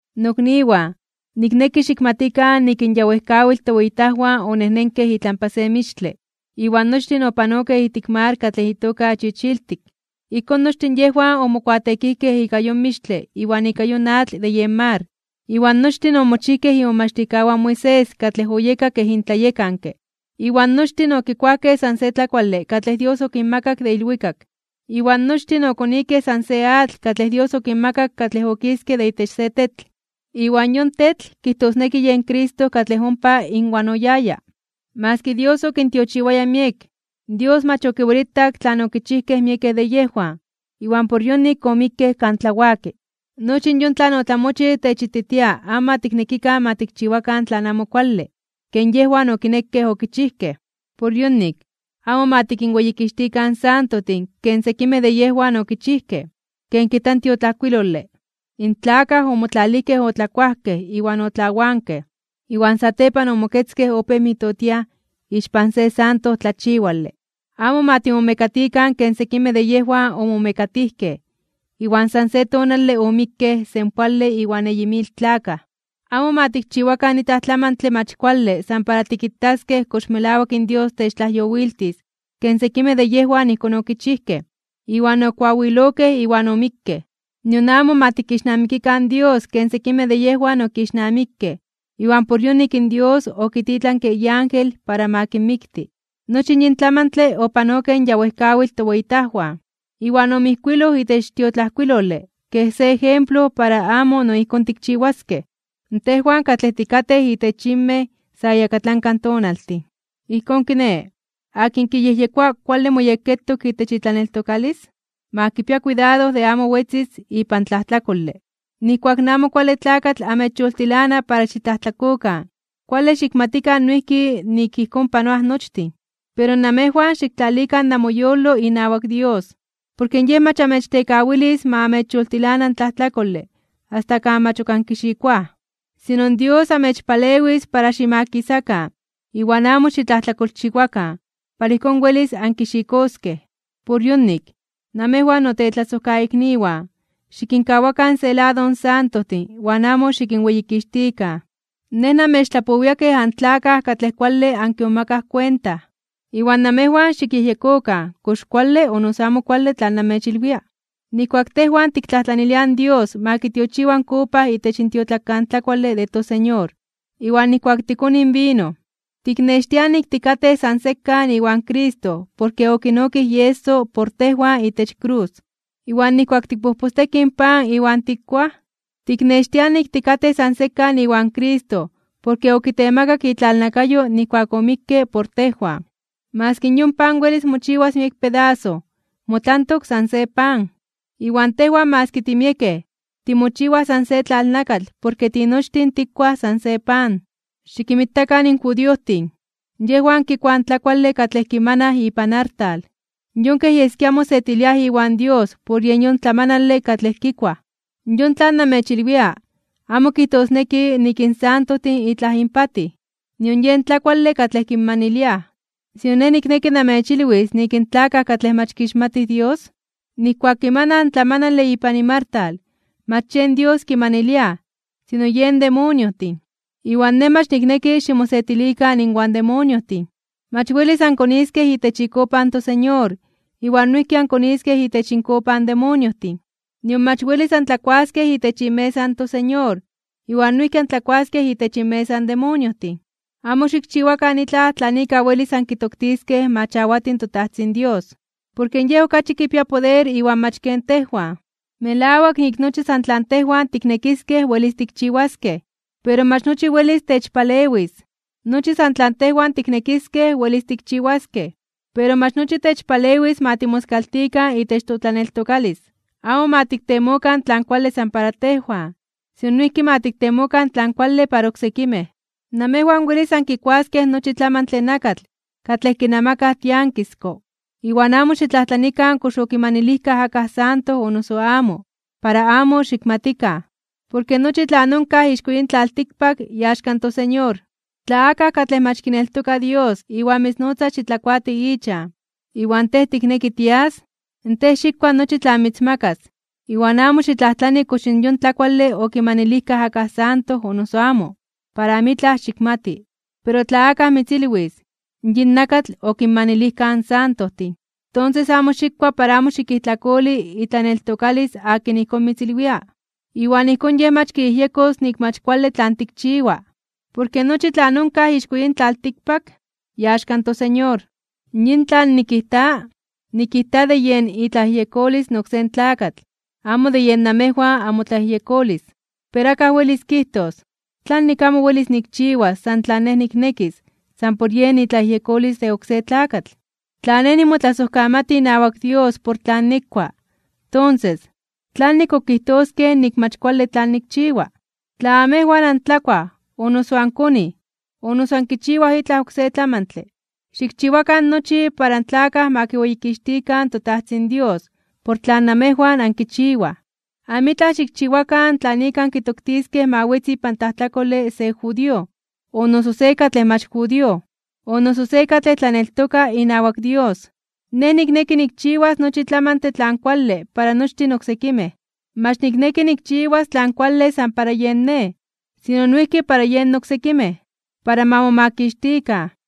Nokniwan, nikneki xikmatikan nik in ya wejkawitl toweyitajwan onejnenkej itlampa se mixtle, iwan nochtin opanokej ijtik mar katlej itoka Chichiltik. Ijkón nochtin yejwan omokuateekijkej ika yon mixtle iwan ika yon atl de yen mar, iwan nochtin omochijkej imomachtijkawan in Moisés katlej oyeka kej intlayekanke. Iwan nochtin okikuajkej san se tlakuale katlej Dios okinmakak de ilwikak. Iwan nochtin okonikej san se atl katlej Dios okinmakak katlej okiske de itech se tetl. Iwan yon tetl kijtosneki yen Cristo katlej ompa inwan oyaya. Maski Dios okintiochiwaya miek, Dios mach okiwelitak tlan okichijkej miekej de yejwan, iwan por yonik omikkej kan tlawaki. Nochi yon tlan otlamochij techititia amo ma tiknekikan ma tikchiwakan tlan amo kuale, ken yejwan okinekej okichijkej. Por yonik, amo ma tikinweyikixtikan in santojtin ken sekimej de yejwan okichijkej, ken kijta in tiotlajkuilole: “In tlakaj omotlalijkej otlakuajkej iwan otlawankej, iwan satepan omoketzkej opéj mijtotiaj ixpan se santo tlachiwale.” Amo ma timomekatikan ken sekimej de yejwan omomekatijkej, iwan san se tonale omikkej senpoale iwan eyi mil tlakaj. Amo ma tikchiwakan itlaj tlamantle mach kuale san para tikitaskej kox melawak in Dios techtlajyowiltis ken sekimej de yejwan ijkón okichijkej, iwan okoawilokej iwan omikkej. Nion amo ma tikixnamikikan in Dios ken sekimej de yejwan okixnamikej, iwan por yonik in Dios okititlanke iángel para ma kinmikti. Nochi yin tlamantle opanokej in ya wejkawitl toweyitajwan, iwan omijkuiloj itech tiotlajkuilole kej se ejemplo para amo no ijkón tikchiwaskej, tejwan katlej tikatej itech yinmej sa iyakatlanka tonaltin. Ijkón kiné, akin kiyejyekoa kuale moyekketok itech itlaneltokalis, ma kipia kuidado de amo wetzis ipan tlajtlakole. Nijkuak in Amo Kuale Tlakatl amechyoltilana para xitlajtlakokan, kuale xikmatikan noijki nik ijkón panoaj nochtin. Pero namejwan xiktlalikan namoyolo inawak Dios, porke Yej mach amechtekawilis ma amechyoltilana in tlajtlakole asta kan mach ok ankixikoaj. Sino, Dios amechpalewis para ximakisakan iwan amo xitlajtlakolchiwakan, para ijkón welis ankixikoskej. Por yonik, namejwan notetlasojkaikniwan, xikinkawakan se lado in santojtin iwan amo xikinweyikixtikan. Nej namechtlapowia kej antlakaj katlej kuale ankimomakaj kuenta. Iwan namejwan xikyejyekokan kox kuale o noso amo kuale tlan nemechilwia. Nijkuak tejwan tiktlajtlaniliaj in Dios ma kitiochiwa in kopa itech in tiotlakantlakuale de toSeñor, iwan nijkuak tikonij in vino, tiknextiaj nik tikatej san sekan iwan Cristo porke okinokij ieso por tejwan itech krus. Iwan nijkuak tikpojpostekij in pan iwan tikuaj, tiknextiaj nik tikatej san sekan iwan Cristo porke okitemakak itlalnakayo nijkuak omikke por tejwan. Maski yon pan welis mochiwas miek pedaso, motlantok san se pan. Iwan tejwan maski timiekej, timochiwaj san se tlalnakatl porke tinochtin tikuaj san se pan. Xikinmitakan in judiojtin. Yejwan kikuaj in tlakuale katlej kimanaj ipan artal, yon kej yeskia mosetiliaj iwan Dios por yen yon tlamanale katlej kikuaj. Yon tlan namechilwia amo kijtosneki nik in santojtin itlaj inpatij, nion yen tlakuale katlej kinmaniliaj. Sino nej nikneki namechilwis nik in tlakaj katlej mach kixmatij Dios, nijkuak kimanaj tlamanale ipan inmartal, mach yen Dios kimaniliaj, sino yen demoniojtin. Iwan nej mach nikneki ximosetilikan inwan demoniojtin. Mach welis ankoniskej itech ikopa in toSeñor iwan noijki ankoniskej itech inkopa in demoniojtin. Nion mach welis antlakuaskej itech imesa in toSeñor iwan noijki antlakuaskej itech inmesa in demoniojtin. Amo xikchiwakan itlaj tlan ika welis ankitoktiskej ma chawati in toTajtzin Dios, porke Yej okachi kipia poder iwan mach ken tejwan. Melawak nik nochi san tlan tejwan tiknekiskej welis tikchiwaskej. Pero mach nochi welis techpalewis. Nochi san tlan tejwan tiknekiskej welis tikchiwaskej, pero mach nochi techpalewis ma timoskaltikan itech totlaneltokalis. Amo ma tiktemokan tlan kuale san para tejwan, sino noijki ma tiktemokan tlan kuale para oksekimej. Namejwan welis ankikuaskej nochi tlamantle nakatl katlej kinamakaj tiankisko iwan amo xitlajtlanikan kox okimanilijkaj akaj santo o noso amo, para amo xikmatikan. Porke nochi tlan onkaj ixko yin tlaltikpak, iaxka in toSeñor. Tla akaj katlej mach kineltoka Dios iwan mitznotza xitlakuati ichan, iwan tej tikneki tias, tej xikua nochi tlan mitzmakas, iwan amo xitlajtlani kox yon tlakuale okimanilijkaj akaj santo o noso amo, para amitlaj xikmati. Pero tla akaj mitzilwis: “Yin nakatl okinmanilijkaj in santojtin”, tonses amo xikua para amo xikijtlakoli itlaneltokalis akin ijkón mitzilwia, iwan ijkón yej mach kiyejyekos nik mach kuale tlan tikchiwa. Porke nochi tlan onkaj ixko yin tlaltikpak, iaxka in toSeñor. Yin tlan nikijta, nikijta de yen itlayejyekolis in oksé tlakatl, amo de yen namejwan amotlayejyekolis. Pero akaj welis kijtos: “¿Tlanik amo welis nikchiwas san tlan nej niknekis san por yen itlayejyekolis de oksé tlakatl? Tla nej nimotlasojkamati inawak Dios por tlan nikua, tonses, ¿tlanik ok kijtoskej nik mach kuale tlan nikchiwa?” Tla namejwan antlakuaj, o noso ankonij, o noso ankichiwaj itlaj oksé tlamantle, xikchiwakan nochi para in tlakaj ma kiweyikixtikan in toTajtzin Dios por tlan namejwan ankichiwaj. Amitlaj xikchiwakan tlan ika ankitoktiskej ma wetzi ipan tlajtlakole se judío, o noso se katlej mach judío, o noso se katlej tlaneltoka inawak Dios. Nej nikneki nikchiwas nochi tlamantle tlan kuale para nochtin oksekimej. Mach nikneki nikchiwas tlan kuale san para yen nej, sino noijki para yen oksekimej, para ma momakixtikan.